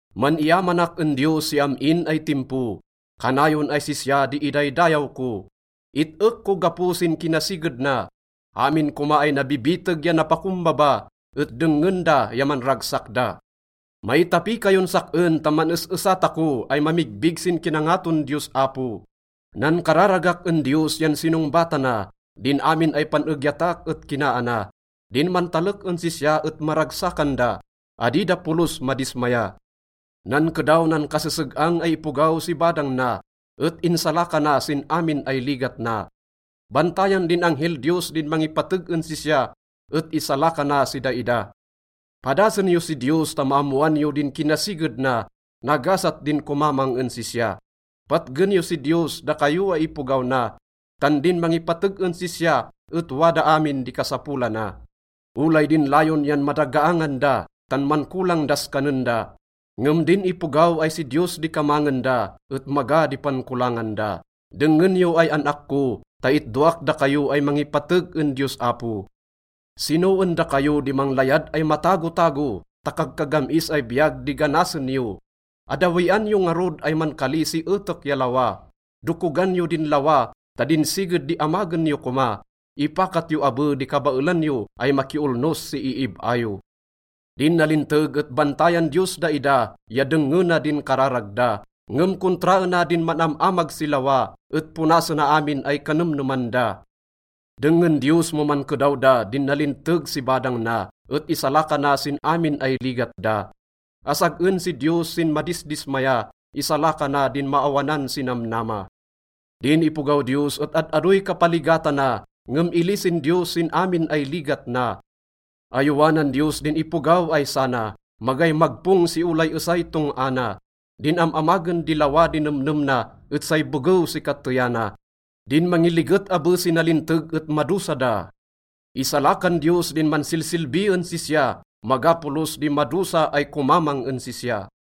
Man-iyamanak en Diyos si am-in ay timpo, kanayon ay sisya di idaydayaw ko. It-ek ko gapo sin kinasiged na. Amin koma ay nabibiteg ya napakombaba et dengngen da ya manragsak da. Maitapi kayon sak-en ta man-es-esa tako ay mamigbig sin kinangaton Diyos Apo. Nankararagak en Diyos yan sinongbatana, din amin ay pan-egyatak et kinaana. Din mantalek en sisya et maragsakan da, adi da polos madismaya. Nankedaw nan kaseseg-ang ay ipogaw si badang na et insalakana sin amin ay ligat na. Bantayan din anghel Diyos din mangipateg en sisya et isalakana si daida. Padasen yo si Diyos ta maammoan yo din kinasiged na. Nagasat din komamang en sisya. Patgen yo si Diyos, dakayo ay ipogaw na, tan din mangipateg en sisya et wada amin di kasapolana. Olay din layon yan madagaangan da tan mankolang das kanen da, ngem din ipogaw ay si Diyos di kamangen da et maga di pankolangan da. Dengngen yo ay an-ak ko ta itdoak dakayo ay mangipateg en Diyos Apo. Sino en dakayo di manglayad ay matagotago ta kagkagam-is ay biyag di ganasen yo? Addawian yo ngarud ay mankali si etek ya lawa. Dokogan yo din lawa ta din siged di amagen yo koma. Ipakat yo abe di kabaelan yo ay makiolnos si iib-a yo. Din nalinteg et bantayan Diyos daida ya dengngena din kararag da. Ngem kontraena din man-am-amag si lawa et ponasena amin ay kanemneman da. Dengngen Diyos mo mankedaw da din nalinteg si badang na et isalakana sin amin ay ligat da. Asag-en si Diyos sin madisdismaya, isalakana din maawanan si namnama. Din ipogaw Diyos et ad-adoy kapaligatana, ngem ilisin Diyos sin amin ay ligat na. Ayowanan Diyos din ipogaw ay sana, magay magpong si olay esay tong-a na. Din am-amagen di lawa di nemnem na et say begew si kateyana. Din mangiliget abe si nalinteg et madosa da. Isalakan Diyos din mansilsilbi en sisya, maga polos di madosa ay komamang en sisya.